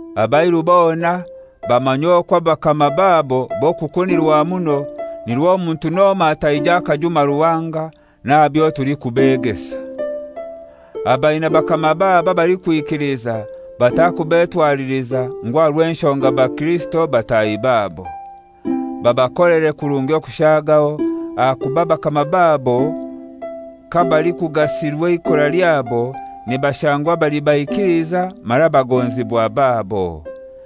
Abairu bona bamanye okwo abakama babo b'okukunirwa muno, nirwo omuntu n'omoi ataije akajuma Ruhanga n'aha byo tulikubegesa. Abaina bakama babo abalikwikiliza batakubetwaliliza ngu aha rw'enshonga bakirisito batahi babo. Babakolere kurungi okushagaho, ahakuba bakama babo kabalikugasirwa eikora lyabo nibashangwa bali baikiliza mara bagonzibwa babo.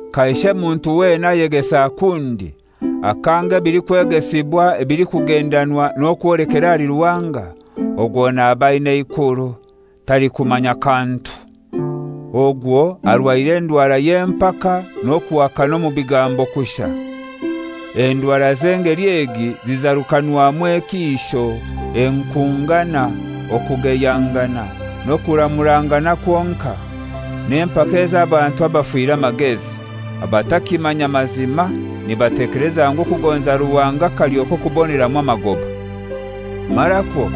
Kaishe muntu wena ayegesa kundi, akanga ebilikwegesibwa ebilikugendanwa n'okwolekera ahali Ruhanga, ogwo naba aina eikuru, talikumanya kantu. Ogwo arwaire endwara y'empaka n'okuhakana omu bigambo kushai. Endwara z'engeli egi zizarukanwamu ekiisho, enkungana, okugeyangana n'okuramurangana kwonkai, n'empaka ez'abantu abafire amagezi, abatakimanya mazima, nibatekeleza ngu okugonza Ruhanga kalyo k'okuboneramu amagoba. Marakwo,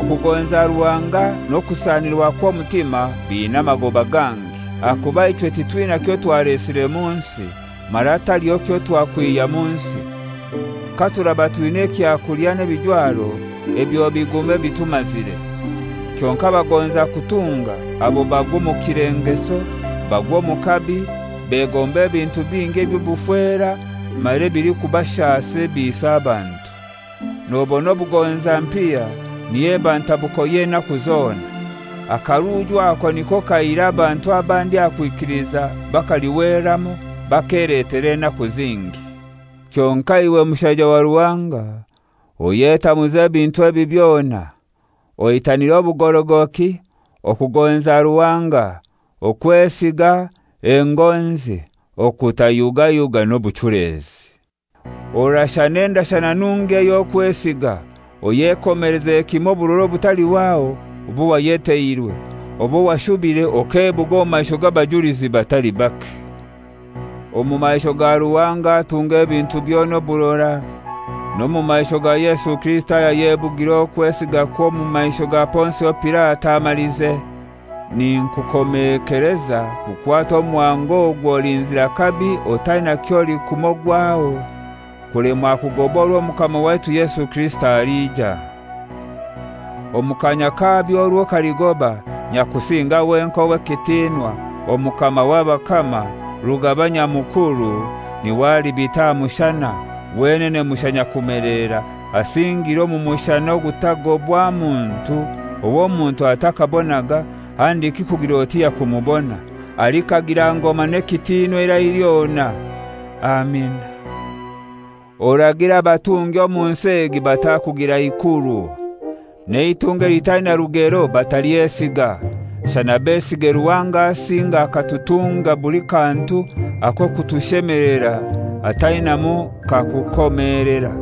okugonza Ruhanga n'okusanirwa kw'omutima biina amagoba gangi. Ahakuba ichwe titwina kyotwalesire mu nsi, mara taliho kyotwakwiha mu nsi. Katuraba twina ekyakulya n'ebijwaro, ebyo bigume bitumazire. Kyonkai abagonza kutunga abo bagwa omu kilengeso, bagwa omu kabi, begomba ebintu bingi eby'obufera mara ebilikubashasa ebiisa abantu. Nobona obugonza mpiya niyo eba ntabuko y'enaku zona. Akaruuju aka niko kaihire abantu abandi aha kwikiliza bakalihweramu, bakeletera enaku zingi. Kyonkai iwe mushaija wa Ruhanga, oyetamuze ebintu ebi byona. Oitanire obugorogoki, okugonza Ruhanga, okwesiga, engonzi, okutayugayuga n'obuchulezi. Orashane endashana nungi ey'okwesiga, oyekomeleze kimoi oburora obutalihwaho obwo wayeteirwe, obwo washubire okebuga omu maisho g'abajulizi batali bake. Omu maisho ga Ruhanga atunga ebintu byona oburora, n'omu maisho ga Yesu Kirisito ayayebugire okwesigakwe omu maisho ga Ponsio Pilato amalize, ninkukomekeleza kukwata omuhango ogu oli nzira kabi otaina ky'olikumogwaho kulemwa kugoba orwo Omukama waitu Yesu Kirisito alija. Omu kanya kabyo orwo kaligoba, Nyakusinga wenkai ow'ekitinwa, Omukama w'abakama, Rugaba Nyamukuru niwe alibita aha mushana, wenene mushai nyakumelera, asingire omu mushana ogutagobwa muntu, ow'omuntu atakabonaga, handiki kugir'oti yakumubona. Alikagira ngoma n'ekitinwa eirai lyona. Amina. Oragire abatungi omu nsi egi batakugira ikuru. N'eitunga elitaina rugero batalyesiga, shana besige Ruhanga asinga akatutunga buli kantu ak'okutushemelera atainamu kakukomelera.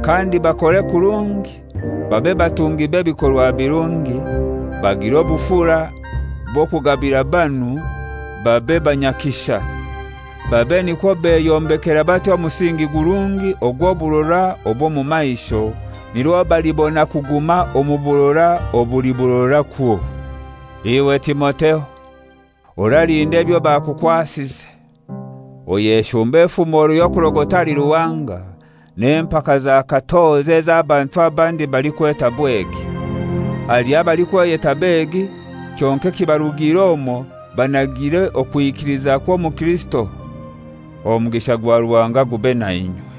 Kandi bakore kurungi, babe batungi b'ebikorwa birungi, bagire obufura bw'okugabira banu, babe banyakisha. Babe nikwo beyombekera batyo omusingi gurungi ogw'oburora obw'omu maisho, nirwo balibona kuguma omu burora obuli burora kwo. Iwe Timotheo, oralinda ebyo bakukwasize. Oyeshumbe efumoro y'okurogota ahali Ruhanga n'empaka za katozi ez'abantu abandi balikweta Bwegi. Haliho abalikweyeta begi, kyonkai ekibarugiire omwo banagiire okwikiliza kw'omukirisito. Omugisha gwa Ruhanga gube nainywe.